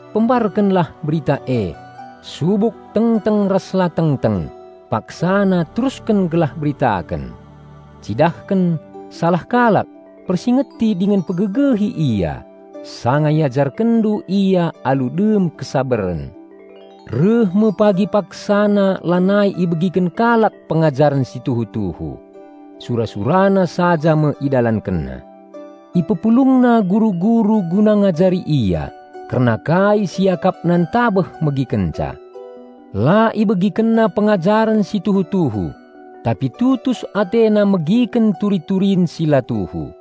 Pembarkenlah Berita e, subuk tengteng ras la tengteng paksana terusken gelah beritaken. Cidahken salah kalak, persingeti dingen pegegehi ia sanga iajarkenndu ia alu dem kesabaren. Reh me pagi paksana lanai ibegiken kalak pengajaren si tuhu-tuhu. Sura-surana saja me idalankenna. Ipepulungna guru-guru guna ngajari ia kerna kai si iakapna ntabeh megikenca. La ibegikenna pengajaren si tuhu-tuhu, tapi tutus atena megiken turi-turin si la tuhu.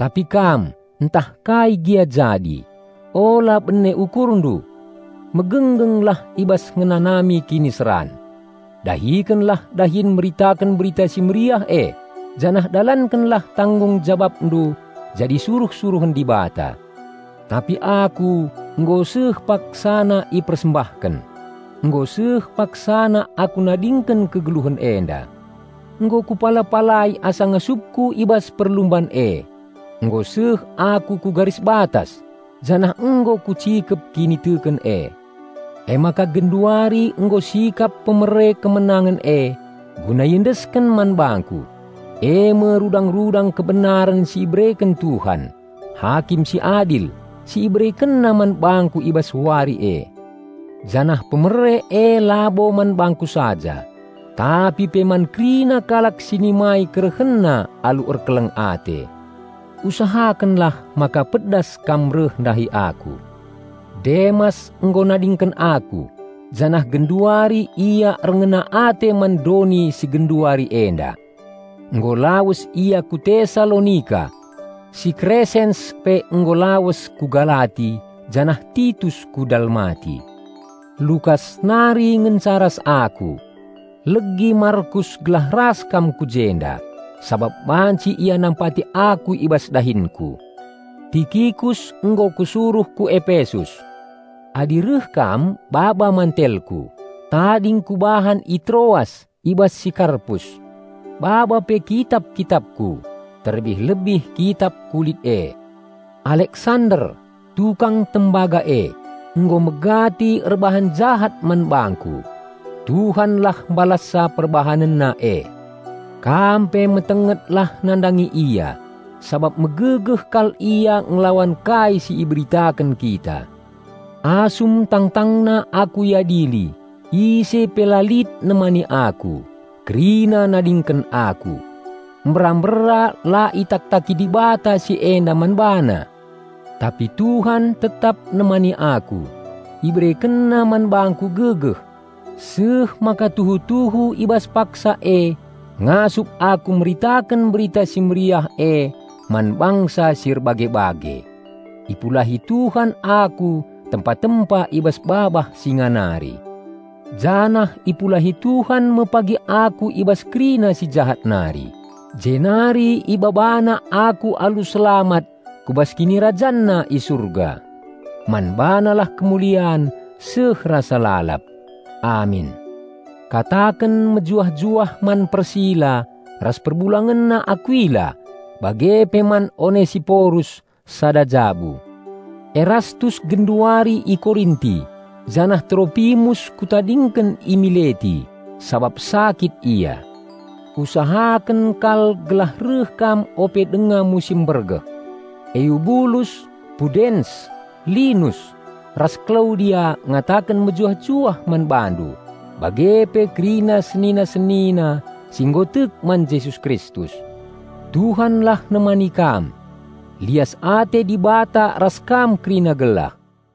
Tapi kam, ntah kai gia jadi, ula bene ukurndu. Megenggenglah i bas ngenanami kiniseran. Dahikenlah dahin meritaken Berita Si Mehuli e, janah dalankenlah tanggung jabapndu jadi suruh-suruhen Dibata. Tapi aku, nggo seh paksana ipersembahken. Nggo seh paksana aku nadingken kegeluhen enda. Nggo kupala-palai asa ngasupku i bas perlumban e, nggo seh aku ku garis batas, janah nggo kucikep kiniteken e. Emaka genduari nggo sikap hadiah kemenangen e guna iendesken man bangku, e me rudang-rudang kebenaren si ibereken Tuhan, Hakim si adil, si IberekenNa man bangku i bas Wari e. Janah hadiah e labo man bangku saja, tapi pe man kerina kalak si nimai KerehenNa alu erkeleng ate. Usahakenlah maka pedas kam reh ndahi aku. Demas nggo nadingken aku janah genduari ia erngena ate man doni si genduari enda. Nggo lawes ia ku Tesalonika. Si Kresens pe nggo lawes ku Galati janah Titus ku Dalmati. Lukas nari ngenca ras aku. Legi Markus gelah ras kam ku jenda, sabap banci ia nampati aku i bas dahinku. Tikikus nggo kusuruh ku Epesus. Adi reh kam baba mantelku, tading kubahan i Troas i bas si Karpus. Baba pe kitap-kitapku, terlebih-lebih kitap kulit e. Aleksander, tukang tembaga e, nggo megati erbahan jahat man bangku. Tuhanlah mbalassa perbahanenna e. Kam pe metengetlah nandangi ia, sabap megegeh kal ia ngelawan kai si iberitaken kita. Asum tangtangna aku iadili, ise pe la lit nemani aku; kerina nadingken aku. Mbera-mbera la itak-taki Dibata si enda man bana! Tapi Tuhan tetap nemani aku, IberekenNa man bangku gegeh, seh maka tuhu-tuhu i bas paksa e ngasup aku meritaken Berita Si Mehuli e man bangsa si erbage-bage. Ipulahi Tuhan aku tempa-tempa i bas babah singa nari. Janah ipulahi Tuhan me pagi aku i bas kerina si jahat nari, jenari IbabaNa aku alu selamat ku bas KinirajanNa i Surga. Man BaNalah kemulian seh rasa lalap. Amin. Kataken mejuah-juah man Persila ras perbulangenna Akuila, bage pe man Onesiporus sada jabu. Erastus genduari i Korinti, janah Tropimus kutadingken i Mileti, sabap sakit ia. Usahaken kal gelah reh kam ope denga musim mbergeh. Eubulus, Pudens, Linus ras Klaudia ngataken mejuah-juah man bandu, bage pe kerina senina-senina si nggo tek man Jesus Kristus. Tuhanlah nemani kam. Lias ate Dibata ras kam kerina gelah.